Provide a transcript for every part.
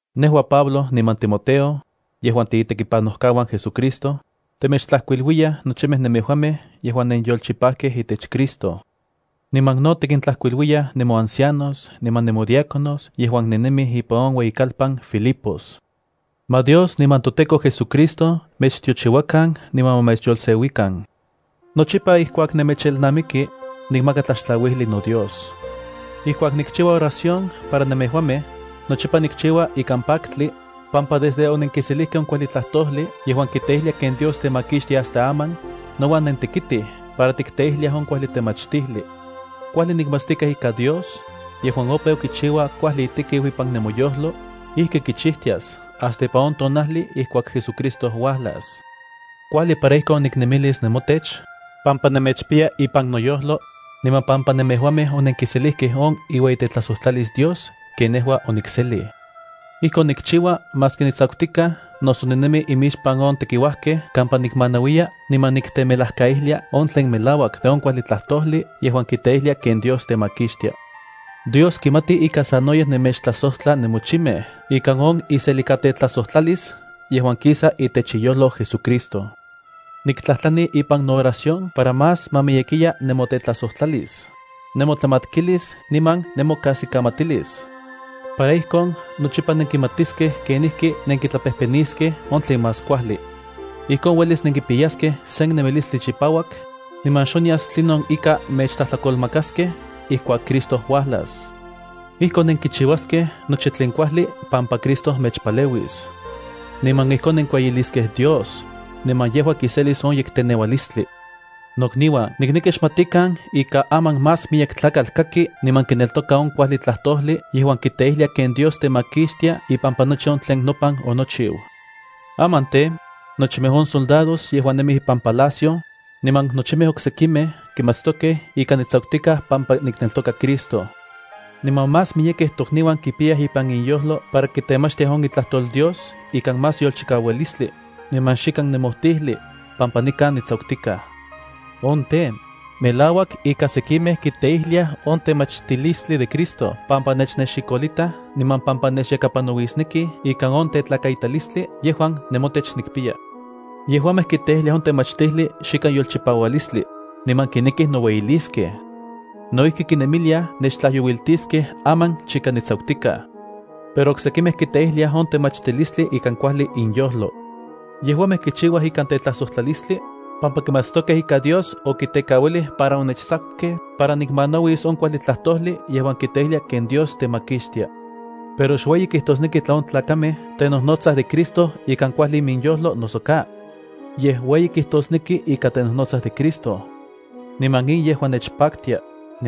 Nejua, Pablo, niman Timoteo, yejuan tiitekipanojkauan JesuCristo, temechtlajkuiluiyaj nochimej nemejuamej yejuan nenyolchipajkej itech Cristo. Niman no tikintlajkuiluiyaj nemoancianos niman nemodiáconos yejuan nennemij ipan on ueyikalpan Filipos. Ma Dios niman toTEKO JesuCristo mechtiochiuakan niman ma mechyolseuikan. Nochipa ijkuak nemechelnamiki, nikmaka tlaxtlauijli noDios. Ijkuak nikchiua oración para nemejuamej, nochipa nikchiua ikan paktli, pampa desde onenkiselijkej on kuajli tlajtojli yejuan kiteijlia ken Dios temakixtia hasta aman, nouan nentekitij para tikteijliaj on kuajli temachtijli. Kuajli nikmatstikaj ika Dios, yejuan opeu kichiua kuajli itekiu ipan nemoyojlo, ijki kichijtias hasta ipan on tonajli ijkuak JesuCristo uajlas. Kuajli para ijkon niknemilis nemotech, pampa nemechpiya ipan noyojlo, niman pampa nemejuamej onenkiselijkej on iueyitetlajsotlalis Dios ken nejua onikselij. Ijkon nikchiua maski nitsakutikaj, noso ninemi imixpan on tekiuajkej kampa nikmanauiya niman niktemelajkaijlia on tlen melauak de on kuajli tlajtojli yejuan kiteijlia ken Dios temakixtia. Dios kimati ika sanoyej nemechtlajsojtla nemochimej ikan on iselikatetlajsojtlalis yejua kisa itech iyojlo JesuCristo. Niktlajtlani ipan nooración para más ma miyekiya nemotetlajsojtlalis, nemotlamatkilis niman nemokajsikamatilis, para ijkon nochipa nenkimatiskej kenijki nenkitlapejpeniskej on tlen más kuajli. Ijkon uelis nenkipiyaskej sen nemilistli chipauak, niman xonyas tlinon ika mechtlajtlakolmakaskej ijkuak Cristo uajlas. Ijkon nenkichiuaskej nochi tlen kuajli pampa Cristo mechpaleuis. Niman ijkon nenkueyiliskej Dios, niman yejua kiselis on yekteneualistli. Nokniuan, nikneki xmatikan ika aman más miyek tlakatl kaki niman kineltoka on kuajli tlajtojli yejuan kiteijlia ken Dios temakixtia ipampa nochi on tlen nopan onochiu. Aman tej, nochimej on soldados yejuan nemij ipan palacio, niman nochimej oksekimej kimatstokej ika nitsakutikaj pampa nikneltoka Cristo. Niman más miyekej tokniuan kipiyaj ipan inyojlo para kitemachtiaj on itlajtol Dios ikan más yolchikaualistli, niman xikan nemojtijli, pampa nikan nitsakutikaj. On tej, melauak ika sekimej kiteijliaj on temachtilistli de Cristo pampa nechnexikolitaj niman pampa nechyakapanauisnekij ikan on tetlakaitalistli yejuan nemotech nikpiya. Yejuamej kiteijliaj on temachtijli xikan yolchipaualistli, niman kinekij noueyiliskej. No ijki kinemiliaj nechtlajyouiltiskej aman chika nitsakutikaj. Pero oksekimej kiteijliaj on temachtilistli ikan kuajli inyojlo. Yejuamej kichiuaj ikan tetlajsojtlalistli, pampa kimatstokej ika Dios okitekauilij para onechtsakukej para nikmanauis on kuajli tlajtojli yejuan kiteijlia ken Dios temakixtia. Pero xueyi kijtosneki tla on tlakamej tenojnotsaj de Cristo ikan kuajli iminyojlo noso ka. Yej ueyi kijtosneki ika tenojnotsaj de Cristo. Niman in yejua nechpaktia,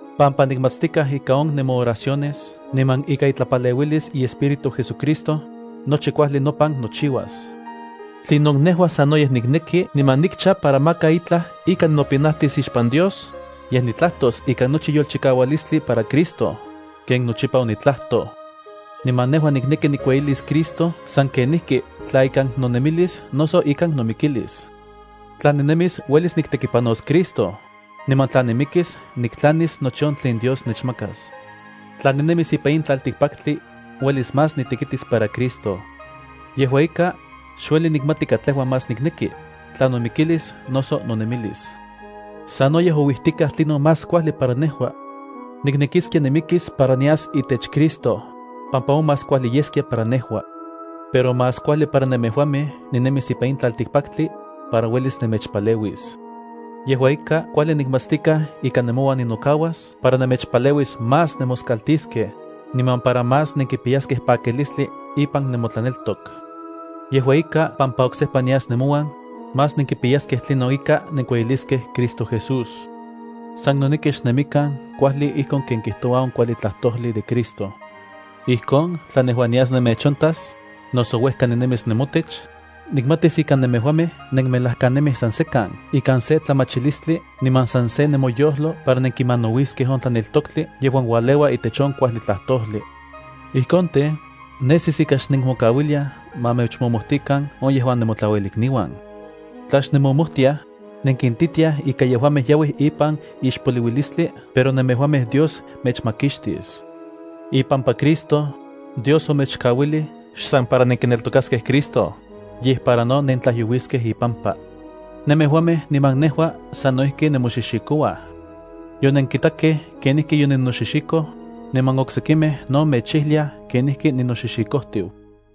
pampa nikmatstikaj ika on nemooraciones niman ikan itlapaleuilis iEspíritu JesuCristo, nochi kuajli nopan nochiuas. Tlinon nejua sanoyej nikneki niman nikcha para maka itlaj ika ninopinajtis ixpan Dios, yej nitlajtos ikan nochi yolchikaualistli para Cristo, ken nochipa onitlajtoj. Niman nejua nikneki nikueyilis Cristo san kenijki tla ikan nonemilis noso ikan nomikilis. Tla ninemis uelis niktekipanos Cristo, niman tla nimikis niktlanis nochi on tlen Dios nechmakas. Tla ninemis ipan in tlaltikpaktli, uelis más nitekitis para Cristo. Yejua ika, xueli nikmati katlejua más nikneki, tla nomikilis noso nonemilis. Sanoyej ouijtikaj tlinon más kuajli para nejua. Niknekiskia nimikis para nias itech Cristo, pampa on más kuajli yeskia para nejua. Pero más kuajli para nemejuamej ninemis ipan in tlaltikpaktli, para uelis nemechpaleuis. Yejua ika, kuajli nikmatstikaj ika nemouan ninokauas para nemechpaleuis más nemoskaltiskej, niman para más nenkipiyaskej pakilistli ipan nemotlaneltok. Yejua ika, pampa oksejpa nias nemouan, más nenkipiyaskej tlinon ika nenkueyiliskej Cristo Jesús. San noneki xnemikan kuajli ijkon ken kijtoua on kuajli tlajtojli de Cristo. Ijkon, tla nejua nias nemechontas, noso uejka ninemis nemotech, nikmatis ika nemejuamej nenmelajkanemij san sekan ikan se tlamachilistli niman san se nemoyojlo para nenkimanauiskej on tlaneltoktli yejuan ualeua itech on kuajli tlajtojli. Ijkon tej, nesis ika xnenmokauiliaj ma mechmomojtikan on yejuan nemotlauelikniuan. Tla xnemomojtiaj, nenkintitiaj ika yejuamej yauij ipan ixpoliuilistli pero nemejuamej Dios mechmakixtis. Ipampa Cristo, Dios omechkauilij xsan para nenkineltokaskej Cristo, yej para no nentlajyouiskej ipampa. Nemejuamej niman nejua sano ijki nemoxixikouaj. Yonenkitakej kenijki yoninoxixikoj niman oksekimej no mechijliaj kenijki ninoxixikojtiu.